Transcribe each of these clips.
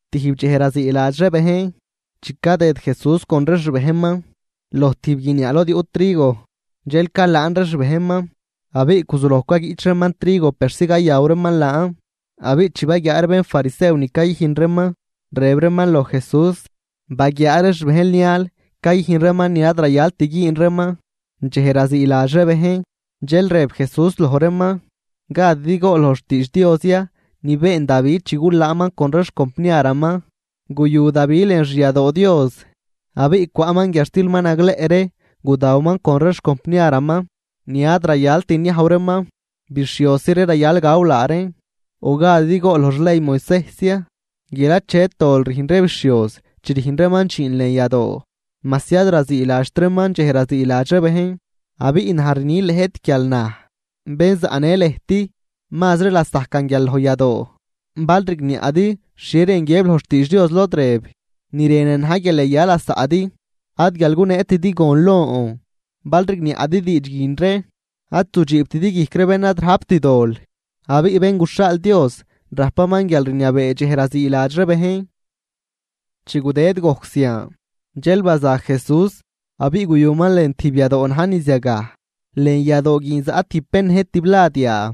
Tijb dxej raziiladx ree bejn, chi cadëd Jesús con ree xbejnman loj tijb guiniaa lod yuꞌ trigo, dxel calaan ree xbejnman abiꞌ guzuloj caguiꞌch reeman trigo persi cayaw reeman laan. Abiꞌ chi baguiaa ree bénfarisew ni cayüjn reeman, rëb reeman loj Jesús: ―Baguiaa ree xbejnl nial cayüjn reeman ni ad rayalt güün reeman dxej raziiladx ree bejn. Dxel rëb Jesús loj reeman: ―¿Gadidi gool loj xtiidx Dios ya ni been Davi chi gulaanman con ree xcompniaraman? Guyu Davi lën xyadoo Dios abiꞌ cwaꞌman guiadxtil ma nagleꞌ ree gudawaman con ree xcompniaraman, ni ad rayalt niajw reeman, bixhiosi ree rayal gaw laa reen. ¿O gadidi gool loj xley Moisejs ya guial achet dol rüjn ree bixhioz chi rüjn reeman dxiin lën yadoo majsi ad raziiladxt reeman dxej raziiladx ree bejn? Abiꞌ naj rni lëjt guial naj, bén zaꞌnë lëjt mazri lasajcan guial loj yadoo. Bal rigniaꞌdi xhie rën guiëb loj xtiidx Dios lod rëb: “Ni rënan na̱j guial yaya lasaꞌdi, ad guial guneetidi gon lon.” Bal rigniaꞌdi diidx guin ree ad zudxiibtidi guijc ree bén ad rajpt dol. Abiꞌ Bén guxhaal Dios rajpaman guialrniabee dxej raziiladx ree bejn. Chi gudëd gojc zian, dxel baza Jesús abiꞌ guyuman lën tijb yadoo na̱j niz yagaj. Lën yadoo guin zaꞌ tijb bén nëjt tiblad yaa.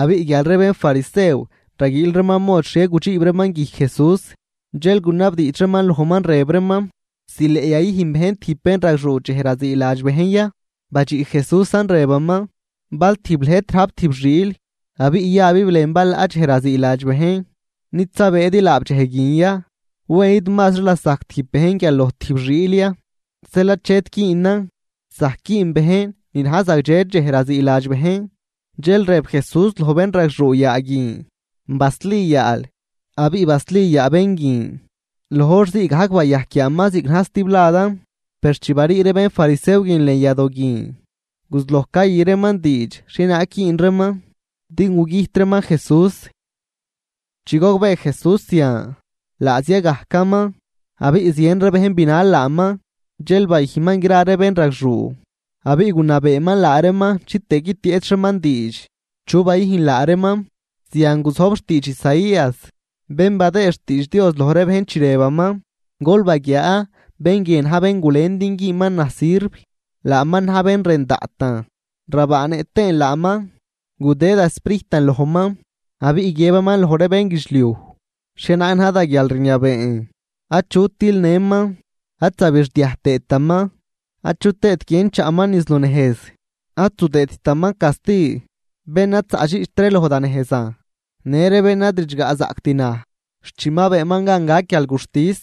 Abiꞌ guial ree bénfarisew raguiil reeman mod xhie gudxiib reeman guijc Jesús, dxel gunabdiidx reeman lojman, rëb reeman: ―¿Zileꞌ yayüjn bejn tijb bénragxuu dxej raziiladx bejn ya? Badxiꞌ Jesúsan rëbaman: ―Bal tijb lëjt rajp tijb xiil, abiꞌ yabib lën balaꞌ dxej raziiladx bejn. ¿Nid zabëëdi laab dxej guin ya? ¿Wen id mazri lasajc tijb bejn guial loj tijb xiil ya? Zeel achet güünan zajc güün bejn ni na̱j zagdxe dxej raziiladx bejn. Dxel rëb Jesús loj bénragxuu yaa guin: ―Basli yaal. Abiꞌ basli yaa bén guin, loj hor ziigajc bayajc yaaman ziꞌc na̱j stibladan. Per chi barii ree bénfarisew guin lën yadoo guin, guzuloj cayü reeman diidx xhienaag güün reeman din gugüjt reeman Jesús. Chi gogbee Jesús zian, laa zia gajcaman, abiꞌ zien ree bejn binal laaman. Dxel bayüjnman gra ree bénragxuu, abiꞌ gunabeeman laa reeman chitëë guitieꞌch reeman diidx chu bayüjn laa reeman. Zian guzojb xtiidx Isaías, bén badëë xtiidx Dios loj ree bejn, chi rëbaman: Gol baguiaa, bén guie na̱j bén gulen din güünman naj sirv, laaman na̱j bén rën daꞌtan, rabaanëꞌ tëën laaman. Gudë da Sprijtan lojman abiꞌ guiëbaman loj ree bénguidxliuj xhienaag na̱j da guialrniabeen. Achut tilnëman, ad zabixdiaj tëëtaman achut tëët guien chaꞌman niz lunejz. Ad zudëëdtaman casti bén ad zaꞌdxiꞌcht ree loj da nejzan, në ree bén ad ridxgaꞌzaꞌct naj, xt chi ma beenman gan gac guialguxtis.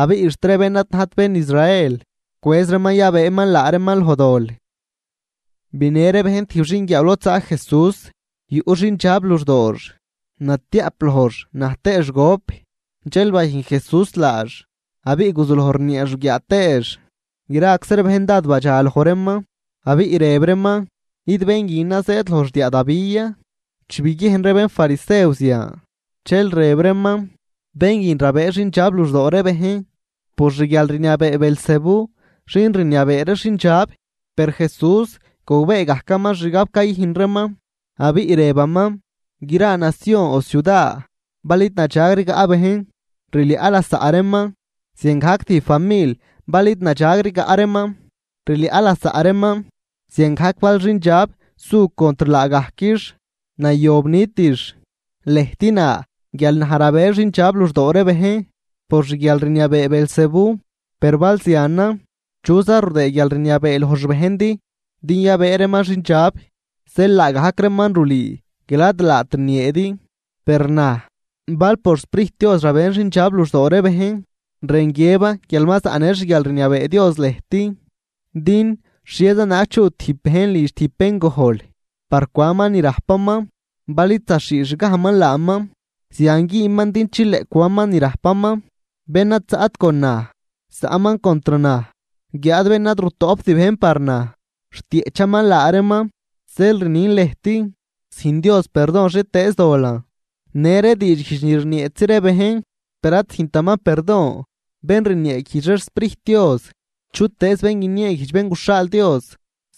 Abiꞌ xt ree bén ad najt bén Israel cwëz reeman yabëëman laa reeman loj dol. Binë ree bejn tijb xinguiaaw lod zaꞌ Jesús, yuꞌ xindxab luxdoox, natiaꞌp lojx naj tëëx gop. Dxel bayüjn Jesús laax abiꞌ guzuloj rnieex ruguiaa tëëx. Graczi ree bejn dád badxaloj reeman, abiꞌ rëb reeman: ―¿Id bén guinan zëëd loj xdiaa Davi ya? Chi biguiejn ree bénfarisew zian, dxel rëb reeman: ―Bén guin rabëë xindxab luxdoo ree bejn por xguialrniabee Beelzebú xin rniabee ree xindxab. Per Jesús gogbee gajcaman xgab cayüjn reeman, abiꞌ rëbaman: ―Gra nacion o ciuda bal id nadxag rigaꞌ bejn, rliaꞌ lasaꞌ reeman, ziangajc tijb famil bal id nadxag rigaꞌ reeman, rliaꞌ lasaꞌ reeman. Ziangajc bal xindxab su contr laagajquix, nayob nitix. Lëjt na guial naj rabë xindxab luxdoo ree bejn por xguialrniabee Beelzebú, per bal zianan, ¿chuza rudëë guialrniabee loj xbejndi din yabëë reeman xindxab? Zeel laagajc reeman rulüü guial ad laat rnieedi. Per naj, bal por xSprijt Dios rabën xindxab luxdoo ree bejn, rën guiëban guial ma zaꞌnë xguialrniabee Dios lëjt. ’Din ¿xhieza naag chuꞌ tijb bejn lidx tijb bén gojl par cwanman ni rajpaman, bal id zaxhiixgajman laaman? Zian güünman din chileꞌ cwanman ni rajpaman. ’Bén ad zaꞌt con naj, zaꞌman contr naj. Guiáad bén ad rutoꞌpt bejn par naj, rtieꞌchaman laa reeman. ’Zeel rnin lëjt: Züjn Dios perdon xhietëëz dolan, në ree diidxguijdx ni rnieetzi ree bejn, per ad züjntaman perdon bén rnieeguijdx ree xSprijt Dios. Chutëëz bén guinieeguijdx Bén guxhaal Dios,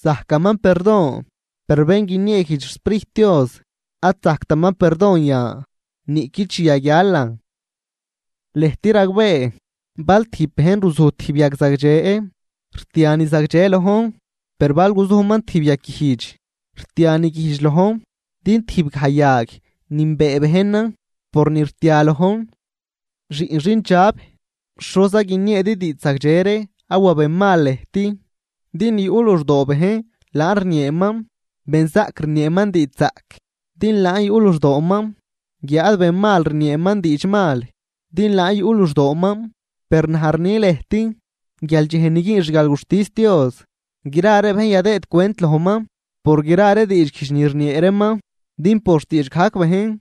zajcaman perdon, per bén guinieeguijdx xSprijt Dios ad zajctaman perdon yan, niꞌqui chi yaguialan. ’Lëjt ragbee, bal tijb bejn ruzuj tijb yag zagdxe, rtia ni zagdxe lojn, per bal guzujman tijb yag guijdx, rtia ni guijdx lojn. Din tijb gaj yag nünbee bejnan por ni rtia lojn. ¡Xiꞌn xindxab! ¿Xoza guinieedi diidx zagdxe ree awa benmal lëjt? Din ni yuꞌ luxdoo bejn laan rnieeman. Benzaꞌc rnieeman diidxzaꞌc, din laan yuꞌ luxdooman. Guiáad benmal rnieeman diidxmal din laan yuꞌ luxdooman. Per naj rni lëjt guial dxej ni güün xguialguxtis Dios, gra ree bejn yadëëd cwent lojman por gra ree diidxguijdx ni rniee reeman. Din por xtiidx gajc bejn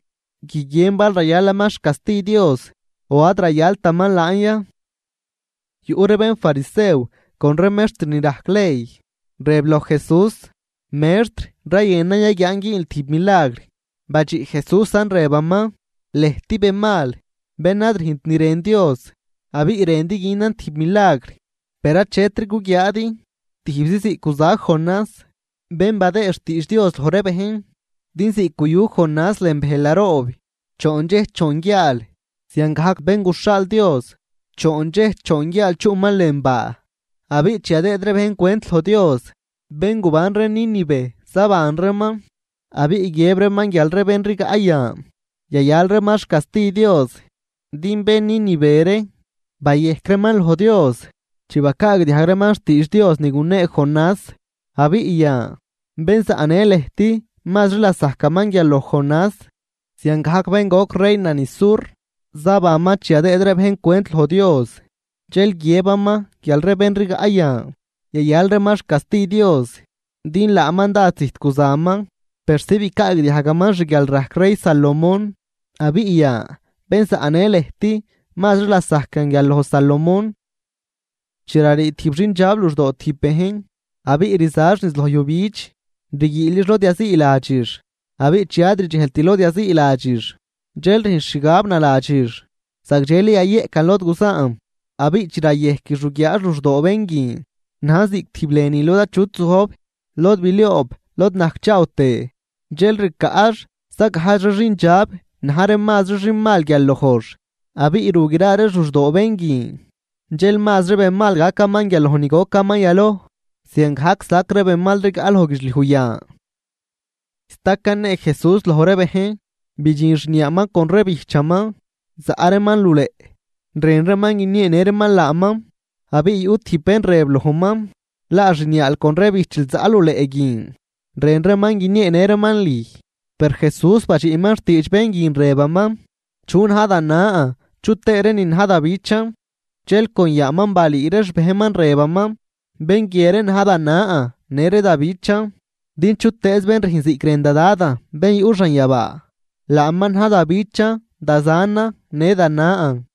guiguien bal rayalaman xcasti Dios o ad rayaltaman laan ya. Yuꞌ ree bénfarisew con ree mextr ni rajc ley, rëb loj Jesús: ―Mextr, rayënan yaguiaan güünl tijb milagr. Badxiꞌ Jesúsan rëbaman: ―Lëjt benmal, bén ad rüjnt ni rën Dios abiꞌ rëndi günan tijb milagr. Per achetri guguiaadi, tijbzi ziꞌc guzac Jonás bén badëë xtiidx Dios loj ree bejn. Din ziꞌc guyu Jonás lën bëjl naroob choon dxej choon guiaal, ziangajc Bén guxhaal Dios, choon dxej choon guiaal chuꞌman lën baa. Abiꞌ chi yadëëd ree bejn cwent loj Dios, bén guban ree Nínive zaban reeman abiꞌ guiëb reeman guial ree bén rigaꞌ yan, yayal reeman xcasti Dios. Din bén Nínive ree bayejc reeman loj Dios chi bacaagdiajg reeman xtiidx Dios ni gunee Jonás. Abiꞌ yan, bén zaꞌnë lëjt mazri lasajcaman guial loj Jonás. Ziangajc bén goc reina niz sur, zabanman chi yadëëd ree bejn cwent loj Dios, dxel guiëbaman guial ree bén rigaꞌ yan, yayal reeman xcasti Dios. Din laaman dád zijt guzaman persi bicaagdiajgaman xguialrajc rey Salomón. Abiꞌ yan, bén zaꞌnë lëjt mazri lasajcan guial loj Salomón. ’Chi rarii tijb xindxab luxdoo tijb bejn, abiꞌ rzax niz loj yujbidx rguiilix lod yaziiladxix. Abiꞌ chi ad rdxejlt lod yaziiladxix, dxel rüjnx xgab naladxix: “Zagdxeli yayeꞌcan lod guzaan.” Abiꞌ chi rayejquix ruguiaax luxdoo bén guin najn ziꞌc tijb lënü lod achut zojb, lod bilioob lod najcchaaw tëë. Dxel ricaꞌx za gajdx xindxab na̱j ree mazri xinmal guial lojx. Abiꞌ ru gra reex luxdoo bén guin. Dxel mazri benmal gacaman guial loj ni gocaman yaloj. Ziangajc sac ree benmal rigaꞌ loj guidxliuj yan. Sta canee Jesús loj ree bejn, bidxin xniaaman con ree bijchaman, zaꞌ reeman luleꞌ, rën reeman guinieenë reeman laaman. Abiꞌ yuꞌ tijb bén rëb lojman: ―Laa xniaal con ree bijchil zaꞌ luleꞌ guin, rën reeman guinieenë reeman lüj. Per Jesús badxiꞌman xtiidx bén guin rëbaman: ―¿Chu na̱j da nan chu tëë ree nin na̱j da bichan? Dxel con yaaman balüü ree xbejnman rëbaman: ―Bén guie ree na̱j da nan në ree da bichan. Din chutëëz bén rüjn ziꞌc rën da Dadan bén yuꞌ xanyabaa, laaman na̱j da bichan, da zanan, në da nan.